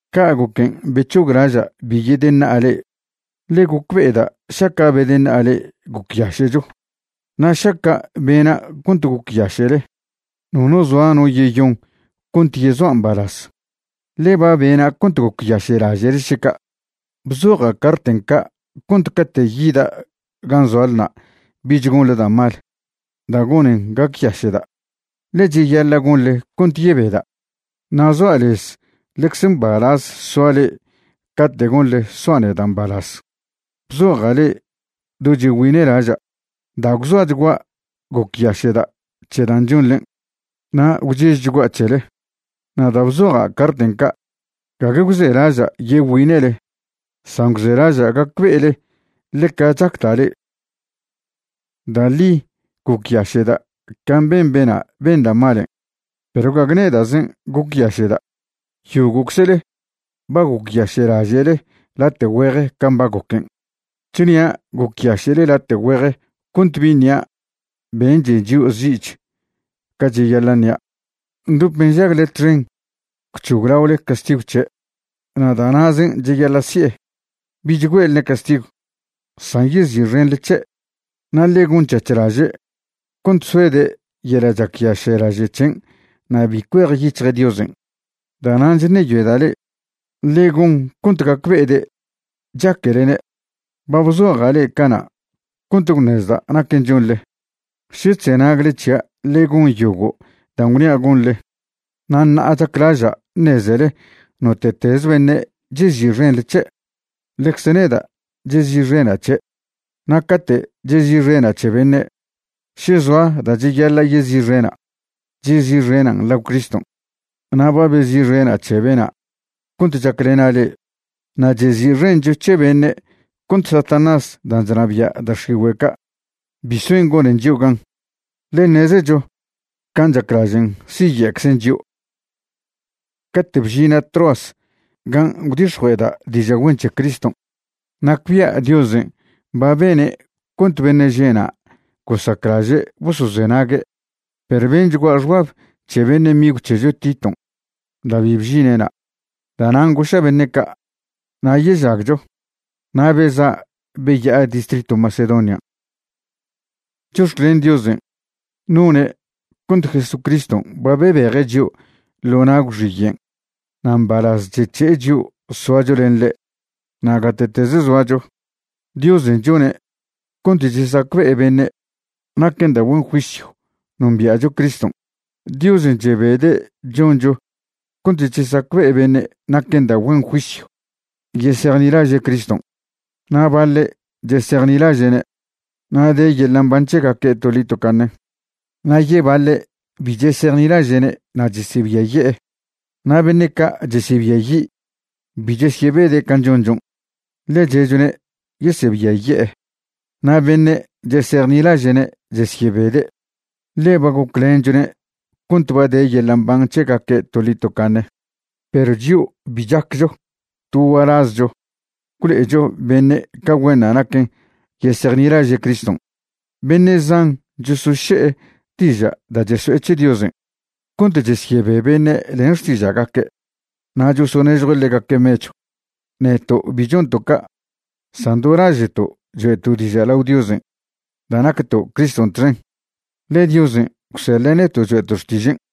Ca' goquen' bec̱hoglaža' bi yedeṉa'a le'e, ḻe gocbe'eda' šaca' bedeṉa'a le'e gocyaše'cho. Na' šaca' bena' cont gocyaše'le, nono zoa no yeyon cont yezoa' mbalaz, ḻe ba bena' cont gocyaše'laže'le še ca'. Bzoja' carten' ca' cont cate' yida' gan' zoalna' bich gonḻe da' mal da' gonen gacyaše'da', ḻe cheyaḻa' gonḻe cont yebeda'. Na' zoa' lez ḻecze mbalaz soa le'e cate' gonḻe soa' neda' mbalaz. Bzoja' le'e do chegüine'laža', da' gwzoachgua' gocyaše'da' c̱he dan' chonḻen', na' gwchežchgua' c̱hele. Na' da' bzoja' carten' ca', gague gwzelaža' yegüine'le, san gwzelaža' gacbe'ele ḻeca chacda' le'e. Da' ḻi gocyaše'da' can' ben bena' ben da' malen', perw gague neda'zen' gocyaše'da'. Yogo'czle ba gocyaše'laže'le late' güeje can' ba goquen'. Chnia' gocyaše'le late' güeje cont bi ṉia' benche' chio' zi'ch ca cheyaḻa' ṉia'. Ndop nžagle txen gwc̱hoglaole castigw c̱he', na' da' na'zen' cheyaḻa' si'e. Bich güe'lne' castigw, san yezi'xenḻe c̱he' na' ḻe gon c̱hac̱h laže' cont soede' yeḻa' chacyaše'laže' c̱hen' na' bi cuejyic̱hje' Diosen'. Da'nan' chṉeyoeda' le'e ḻe gon cont gacbe'ede' chaquelene'. Ba bzoja' le'e cana' cont gwṉezda' naquen' chonḻe, še chzenagle c̱hia' len yogo' dan' gwnia' gonḻe. Na' ṉa'a chaclaža' ṉezele note'teze beṉe' chezi'xenḻe c̱he', ḻecze neda' chezi'xena' c̱he'. Na' cate' chezi'xena' c̱he beṉe', še zoa da' cheyaḻa' yezi'xena', chezi'xenan' lao Criston', na' ba bezi'xena' c̱he bena' cont chaclena' le'e. Na' chezi'xencho c̱he beṉe' cont Satanás dan' chnabia' da' x̱igüe' ca' bi soen gonen chio' gan, ḻe ṉezecho can' chaclažen' siye'czen chio'. Cate' bžina' Troas gan' gwdix̱jue'eda' diža' güen c̱he Criston', nacbia' Diosen' ba bene' cont beṉe' že' na' gosaclaže' bosozenague'. Perw benchgua' xbab c̱he beṉe' migw c̱hecho Titon' da' bi bžine' na'. Da'nan' goša' beṉe' ca': “Nayežagcho”, na' beza' beya'a distritw Macedonian'. Chox̱clen Diosen', none' cont Jesucriston' ba bebeje' chio' ḻo na' gwxiyen' na' mbalaz chec̱he'e chio' soacho len ḻe'. Na' gate'teze zoacho, Diosen' chone' cont chesacbe'e beṉe' naquen da' güen juisyw nombia'cho Criston'. Diosen' chebede' choncho cont chesacbe'e beṉe' naquen da' güen juisyw yesejnilaže' Criston'. Na' baḻe' chesejnilaže'ne' na' de yeḻa' mban c̱hegaque' toḻi tocaṉe, na' yebaḻe' bi chesejnilaže'ne' na' chesebiaye'e. Na' beṉe' ca' chesebiayi' bi chesyebede' can' chonchon', ḻe che'chone' yesebiaye'e. Na' beṉe' chesejnilaže'ne' chesyebede', ḻe ba goclenchone' cont ba de yeḻa' mban c̱hegaque' toḻi tocaṉe. Perw chio' bi chaccho to gualazcho gwlo'echo beṉe' ca güenṉa' naquen yesejnilaže' Criston'. Beṉe' zan chosoše'e diža' da' cheso'e c̱he Diosen' cont chesyebe beṉe' len xtiža'gaque' na' chosonežjue' ḻegaque' mechw. Neto' bi chonto' ca', san do laže'to' choe'to' diža' lao Diosen' da' nacto' Criston' txen, ḻe Diosen' gwseḻe' neto' choe'to' xtižen'.